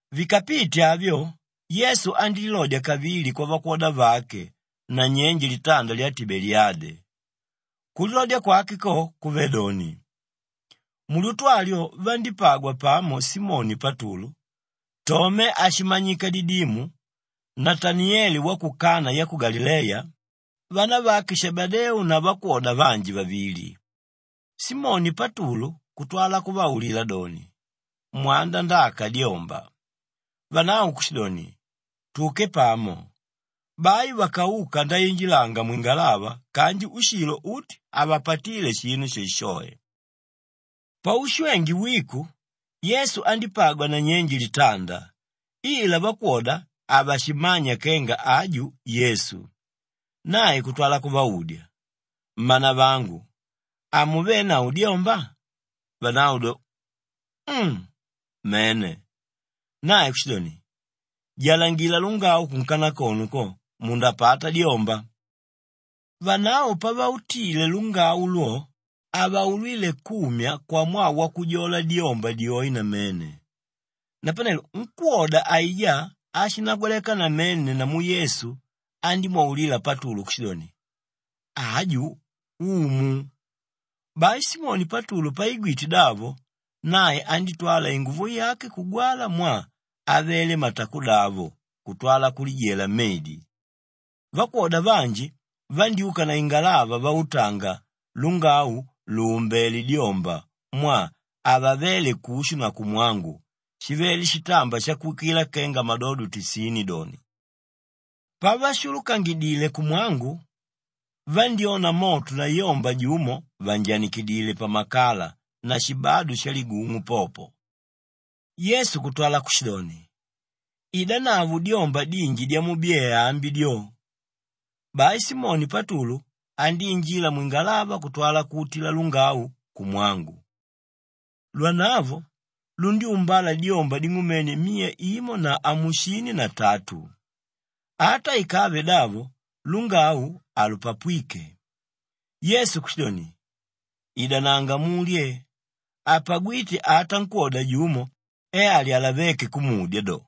Vikapite avyo, Yesu andílilodya kavili kwavakwoda vake nanyenje litanda lya Tibeliyade. Kulilodya kwake ko kuvé doni, mulyutu alyo vandípagwa pamo Simoni Patulu, Tome áshimanyika Didimu, Nataniyele wa ku Kanaa ya ku Galileya, vanavake Shebedeu na vakwoda vanji vavili. Simoni Patulu kutwala kuvaulila doni, “Mwanda ndaaka dyomba.” Vanavo kushidoni, “Tuke pamo.” Bai vakauka ndainjilanga mwingalava kanji ushilo uti havapatíle shinu shoeshoe. Paushwenge wiko, Yesu andípagwa nanyenje litanda ila vakwoda havashimmanya kenga aju Yesu. Nae kutwala kuvaudya, “Mmanavangu, hamuvenavo dyomba?” Vanavo do, “Um, mene.” Nae kushidoni, “Jalangila lungau kunkanakono ko, mundapata dyomba.” Vanavo pavautile lungau lwo, havaulwíle kumya kwamwaa wakujola dyomba dyoe namene. Napanelo nkwóda aijá áshinagwaleka namene namu Yesu andímwaulila Patulu kushidoni, “Aju Umu!” Bai Simoni Patulu paigwite davo, nae andítwala inguvo yake kugwala mwaa avele matakodavo kutwala kulijela mmedi. Vakwoda vanji vandyúka na ingalava vautanga lungau lùumbele dyomba mwaa havavéle kushu na kumwangu shivele shitamba shakuwikila kenga madodo tisini doni. Pavashulukangidile kumwangu, vandyona moto na yomba jumo vànjanikidile pamakala na shibadu shaligung'u popo. Yesu kutwala kushidoni, “Idanavo dyomba dinji dyamubyee ambi dyo!” Bai Simoni Patulu andíinjila mwingalava kutwala kuutila lungau kumwangu. Lwanavo lundyúmbala dyomba ding'umene miya imo na amusini na tatu. Ata ikave davo lungau halupapwíke. Yesu kushidoni, “Idananga mulye!” Hapagwíte ata nkwóda jumo e alyalavéke kumudya do,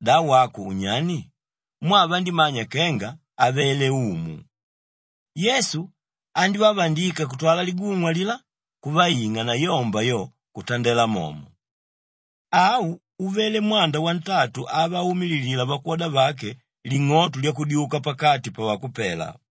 “Da wako unyani?” mwaa vandímanya kenga avele Umu. Yesu andívavandika kutwala ligung'u alilá kuvaing'a na yomba yo, kutandela momo. Au uvele mwanda wantatu avaumililila vakwoda vake ling'oto lyakudyuka pakati pavakupela.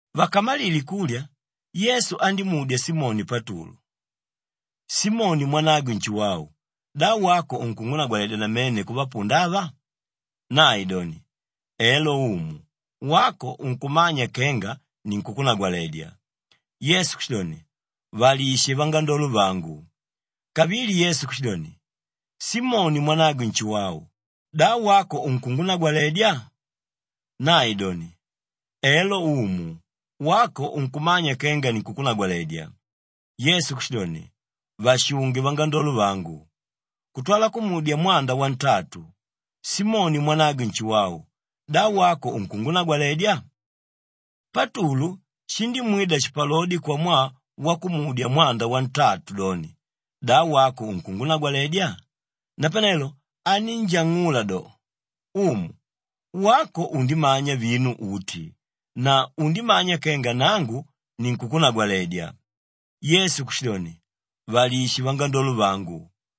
Vakamalile kulya, Yesu andímudya Simoni Patulu, “Simoni mwanagwe Nshuwau, da wako unkungunagwaledya namene kuvapunda ava?” Nae doni, “Elo Umu, wako unkumanya kenga ninkukunagwaledya.” Yesu kushidoni, “Valishe vangandolo vangu.” Kavili Yesu kushidoni, “Simoni mwanagwe Nshuwau, da wako unkungunagwaledya?” Nae doni, “Elo Umu, wako unkumanya kenga ninkunkunagwaledya.” Yesu kushidoni, “Vashunge vangandolo vangu.” Kutwala kumudya mwanda wantatu, “Simoni mwanagwe Nshuwau, da wako unkungunagwaledya?” Patulu shindímwida shipalodi kwamwaa wakumudya mwanda wantatu doni, “Da wako unkungunagwaledya?” Napanelo anínjang'ula do, “Umu, wako undimanya vinu uti na undimanya kenga nangu ninkukunagwaledya.” Yesu kushidoni, “Valishe vangandolo vangu.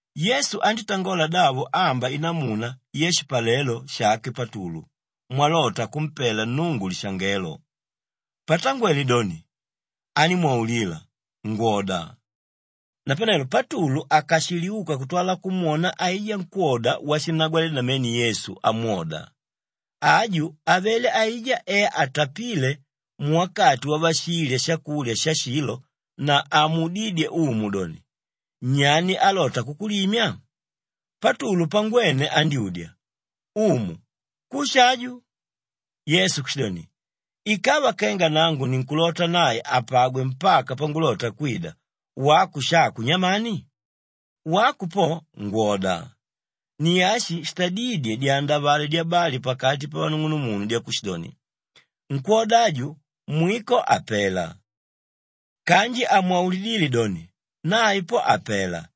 Yesu andítangola davo amba inamuna yashipalelo shake Patulu mwalota kumpela Nnungu lishangelo. Patangwele doni, animwaulila, “Ngwoda.” Napanelo Patulu akashiliuka kutwala kumwona aijá nkwóda washinnagwaledya namene Yesu amwoda. Aju avele aijá e atapíle muwakati wavashilya shakulya shashilo na amuudídye Umu doni, “Nyani álota kukulimya?” Patulu pangwene andyúdya, “Umu, kushi aju?” Yesu kushidoni, “Ikava kenga nangu ninkulota nae apagwe mpaka pangulota kwida, wako shako nyamani? Wako po, ngwoda!” Ni ashi shitadídye dyandavale dyabali pakati pavanung'unumunu dyakushidoni, “Nkwóda aju, mwiko hapela.” Kanji hamwaulidíle doni, “Nae po, hapela,”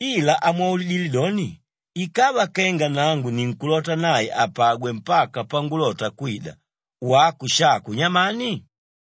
ila amwaulidile doni, “Ikava kenga nangu ninkulota nae apagwe mpaka pangulota kwida, wako shako nyamani?”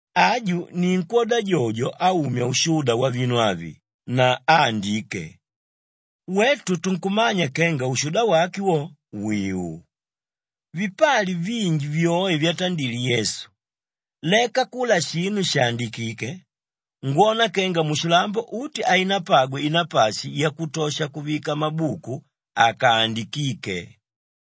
Aju ni nkwóda jojo áumya ushuda wavinu avi na áandike. Wetu tunkumanya kenga ushuda wake wo, wìu. Vipali vinji vyoe vyatandile Yesu. Leka kula shinu shàandikike, ngwona kenga mushilambo uti hainapagwe inapashi yakutosha kuvika mabuku akaandikíke.